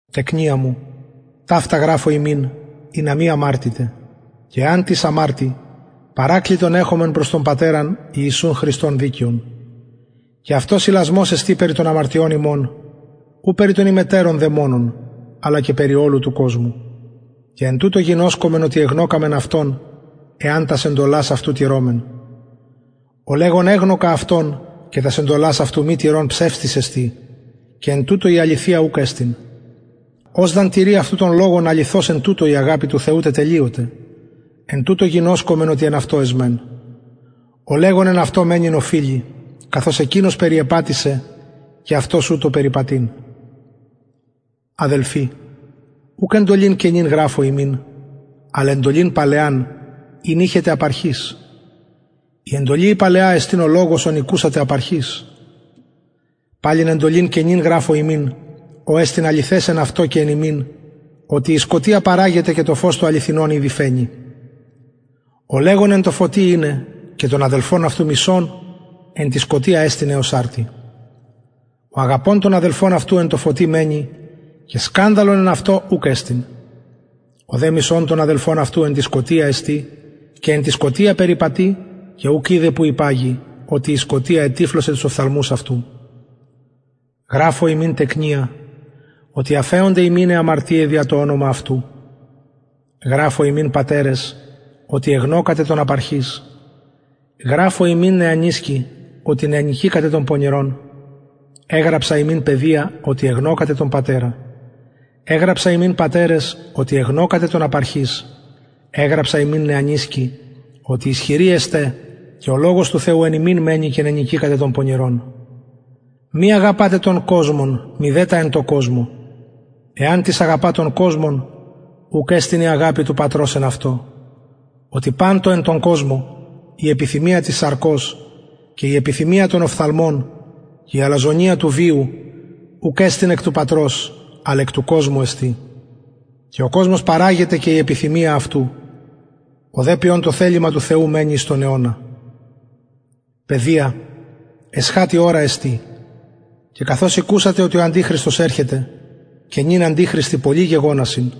τεκνια μου ταυτα γραφω υμιν ινα μη αμαρτητε και εαν τις αμαρτη παρακλητον εχομεν προς τον πατερα ιησουν χριστον δικαιον και αυτος ιλασμος εστιν περι των αμαρτιων ημων ου περι των ημετερων δε μονον αλλα και περι ολου του κοσμου και εν τουτω γινωσκομεν οτι εγνωκαμεν αυτον εαν τας εντολας αυτου τηρωμεν ο λεγων εγνωκα αυτον και τας εντολας αυτου μη τηρων ψευστης εστιν και εν τουτω η αληθεια ουκ εστιν ος δ αν τηρη αυτου τον λογον αληθως εν τουτω η αγαπη του θεου τετελειωται εν τουτω γινωσκομεν οτι εν αυτω εσμεν ο λεγων εν αυτω μενειν οφειλει καθως εκεινος περιεπατησεν και αυτος ουτως περιπατειν αδελφοι ουκ εντολην καινην γραφω υμιν αλλ εντολην παλαιαν ην ειχετε απ αρχης η εντολη η παλαια εστιν ο λογος ον ηκουσατε απ αρχης παλιν εντολην καινην γραφω υμιν ο εστιν αληθες εν αυτω και εν υμιν οτι η σκοτια παραγεται και το φως το αληθινον ηδη φαινει ο λεγων εν τω φωτι ειναι και τον αδελφον αυτου μισων εν τη σκοτια εστιν εως αρτι ο αγαπων τον αδελφον αυτου εν τω φωτι μενει και σκανδαλον εν αυτω ουκ εστιν ο δε μισων τον αδελφον αυτου εν τη σκοτια εστιν και εν τη σκοτια περιπατει και ουκ οιδεν που υπαγει οτι η σκοτια ετυφλωσεν τους οφθαλμους αυτου γραφω υμιν τεκνια οτι αφεωνται υμιν αι αμαρτιαι δια το ονομα αυτου γραφω υμιν πατερες οτι εγνωκατε τον απ αρχης γραφω υμιν νεανισκοι οτι νενικηκατε τον πονηρον γραφω υμιν παιδια οτι εγνωκατε τον πατερα εγραψα υμιν πατερες οτι εγνωκατε τον απ αρχης εγραψα υμιν νεανισκοι οτι ισχυροι εστε και ο λογος του θεου εν υμιν μενει και νενικηκατε τον πονηρον μη αγαπατε τον κοσμον μηδε τα εν τω κοσμω εαν τις αγαπα τον κοσμον ουκ εστιν η αγαπη του πατρος εν αυτω οτι παν το εν τω κοσμω η επιθυμια της σαρκος και η επιθυμια των οφθαλμων και η αλαζονεια του βιου ουκ εστιν εκ του πατρος αλλ εκ του κοσμου εστιν και ο κοσμος παραγεται και η επιθυμια αυτου ο δε ποιων το θελημα του θεου μενει εις τον αιωνα παιδια εσχατη ωρα εστιν και καθως ηκουσατε οτι ο αντιχριστος ερχεται και νυν αντιχριστοι πολλοι γεγονασιν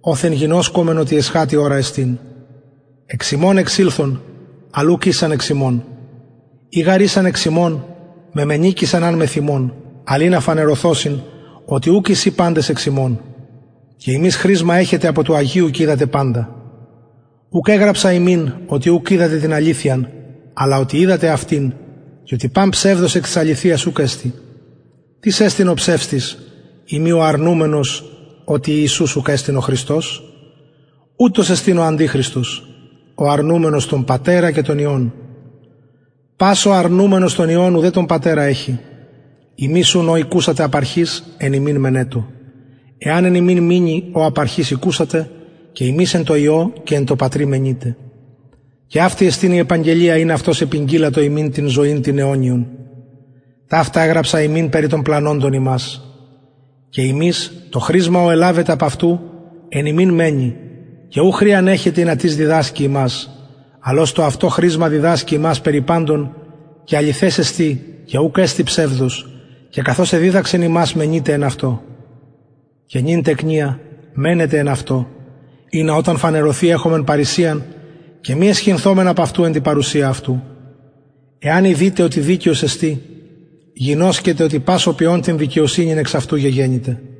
οθεν γινωσκομεν οτι εσχατη ωρα εστιν εξ ημων εξηλθον αλλ ουκ ησαν εξ ημων ει γαρ ησαν εξ ημων μεμενηκεισαν αν μεθ ημων αλλ ινα φανερωθωσιν οτι ουκ εισιν παντες εξ ημων και υμεις χρισμα εχετε απο του αγιου και οιδατε παντα ουκ εγραψα υμιν οτι ουκ οιδατε την αληθειαν αλλ οτι οιδατε αυτην και οτι παν ψευδος εκ της αληθειας ουκ εστιν τις εστιν ο ψευστης ει μη ο αρνουμενος οτι ιησους ουκ εστιν ο χριστος ουτος εστιν ο αντιχριστος ο αρνουμενος τον πατερα και τον υιον πας ο αρνουμενος τον υιον ουδε τον πατερα εχει υμεις ουν ο ηκουσατε απ αρχης εν υμιν μενετω εαν εν υμιν μεινη ο απ αρχης ηκουσατε και υμεις εν τω υιω και εν τω πατρι μενειτε και αυτη εστιν η επαγγελια ην αυτος επηγγειλατο ημιν την ζωην την αιωνιον ταυτα εγραψα υμιν περι των πλανωντων υμας και υμεις το χρισμα ο ελαβετε απ αυτου εν υμιν μενει και ου χρειαν εχετε ινα τις διδασκη υμας αλλ ως το αυτο χρισμα διδασκει υμας περι παντων και αληθες εστιν και ουκ εστιν ψευδος και καθως εδιδαξεν υμας μενειτε εν αυτω και νυν τεκνια μενετε εν αυτω ινα οταν φανερωθη εχωμεν παρρησιαν και μη αισχυνθωμεν απ αυτου εν τη παρουσια αυτου εαν ειδητε οτι δικαιος εστιν γινωσκετε οτι πας ο ποιων την δικαιοσυνην εξ αυτου γεγεννηται